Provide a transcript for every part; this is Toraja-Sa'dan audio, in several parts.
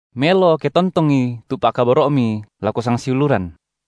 Melo ke tontongi tu pa’kaboro’mi lako sangsiuluran.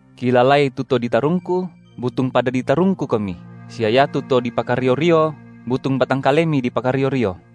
Kilalai tu to ditarungku, butung pada ditarungkukomi, sia iatu to dipakario-rio butung batang kalemi dipakario-rio.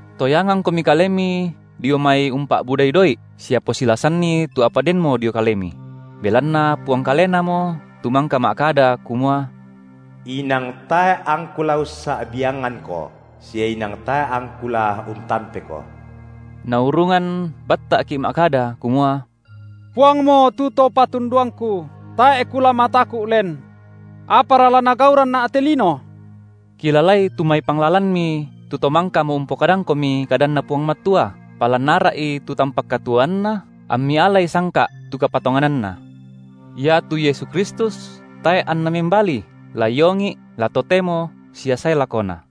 Toyangangkomi kalemi dio mai umpa’budai doi’, sia posilasanni tu apa denmo dio kalemi; belanna Puang Kalenamo tu mangka ma’kada, kumua: Inang tae’ angKu la ussa’biangangko, sia inang tae’ angKu la untampeko. Naurungan batta’ki’ ma’kada, kumua: Puangmo tu To patunduangku, tae’ kula mataku’ len. Apara la nagauranna’ telino? Kilalai tu mai panglalanmi tu to mangkamo umpokadangkomi kadanNa Puang Matua, palan ara’i tu tampak katuoanna, ammi alai sangka’ tu kapatongananna. Iatu Yesu Kristus tae’ anna membali, la iongi’, la totemo sia sae lakona.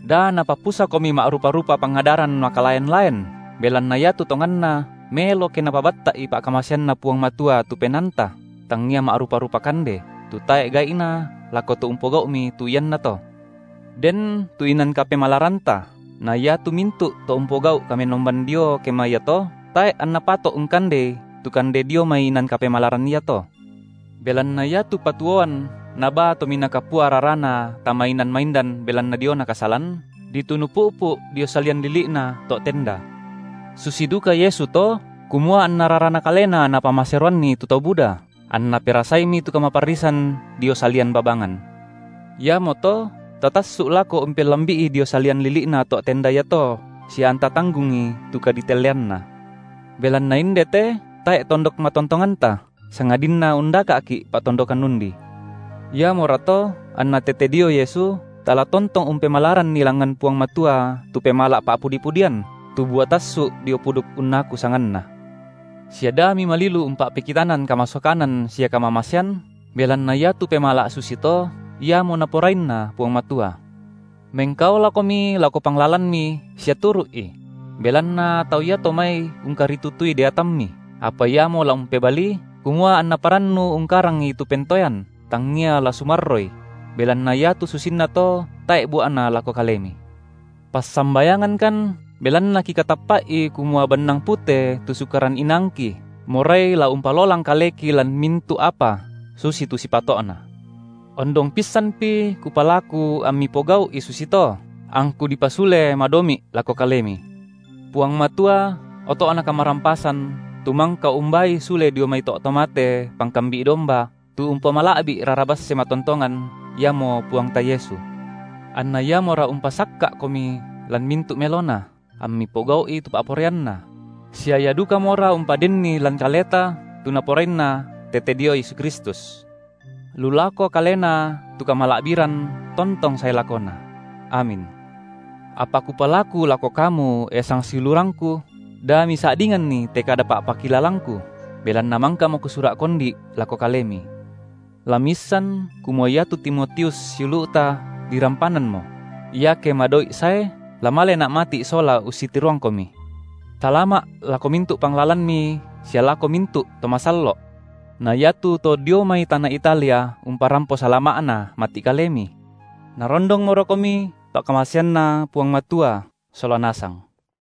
Da napapusakomi ma’rupa-rupa pangadaran makalaen-laen, belanna iatu tonganna, melo ke napabatta’i pa’kamaseanNa Puang Matua tu penaanta, tangia ma’rupa-rupa kande, tu tae’ gai’na lako to umpogau’mi tu iannato. Den tu inan kapemalaranta, na iatu mintu’ to umpogau’ kamenomban dio kema iato, tae’ anna pato’ ungkandei tu kande dio mai inan kapemalaran iato. Belanna iatu patuoan nabaa Tominaa Kapua rarana tama inan maindan belanna diona kasalan, ditunu pu’pu’ dio salian lili’na to’ tenda’. Susi duka Yesu to, kumua anna raraNa Kalena Napamaseroanni tu tau buda, anNa perasaimi tu kamaparrisan dio salian babangan. Iamoto tatassu’ lako umpellambi’i dio salian lili’na to’ tenda iato sia anta tanggungi tu kaditelleanNa. Belanna inde te tae’ tondok matontonganta, sangadinna undaka’ki’ pa’tondokan undi. Iamorato anna tete dio Yesu, tala tontong umpemalaranni langngan Puang Matua tu pemala’ pa’pudi-pudian, tu bua tassu’ dio puduk unnaku sanganNa. Sia da mimalilu umpa’pekitanan kamasokanan sia kamamasean belanna iatu pemala’ susito iamo Naporainna Puang Matua. Mengkaolakomi lako panglalanmi sia turu’i; belanna tau iato mai ungkaritutui deatammi, apa iamo la umpebalii, kumua anna parannu ungkarangi tu pentoean, tangia la sumarroi; belanna iatu susinnato tae’ bua’na lako kalemi. Passambayangangkan, belanna kikatappa’i kumua bannang pute tu sukaran inaangki morai la umpalolang kaleki lan mintu’ apa susitu sipato’na. Ondong pissanpi kupalaku ammi pogau’i susito, angku dipasule madomi’ lako kalemi. Puang Matua, oto’na kamarampasan, tu mangka umbaai sule dio mai to’ to mate Pangkambi’ domba, tu umpomala’bi’ rara basse matontongan iamo Puangta Yesu, anna Iamora umpasakka’komi lan mintu’ melona, ammi pogau’i tu pa’poraianNa; sia Ia dukamora umpadenni lan kaleta tu Naporainna tete dio Yesu Kristus. Lu lako Kalena tu kamala’biran tontong sae lakona! Amin. Apa kupalaku lako kamu, e sangsiulurangku, da misa’dinganni te kada pa’pakilalangku, belanna mangkamo kusura’ kondi’ lako kalemi. La miissan kumua iatu Timotius, siulu’ta dirampananmo; iake madoi’ sae, la malena’ mati’ sola ussitiroangkomi. Salama’ lako mintu’ panglalanmi sia lako mintu’ to masallo’. Na iatu to dio mai tana Italia umparampo salama’na mati’ kalemi. Narondongmorokomi pa’kamaseanNa Puang Matua sola nasang.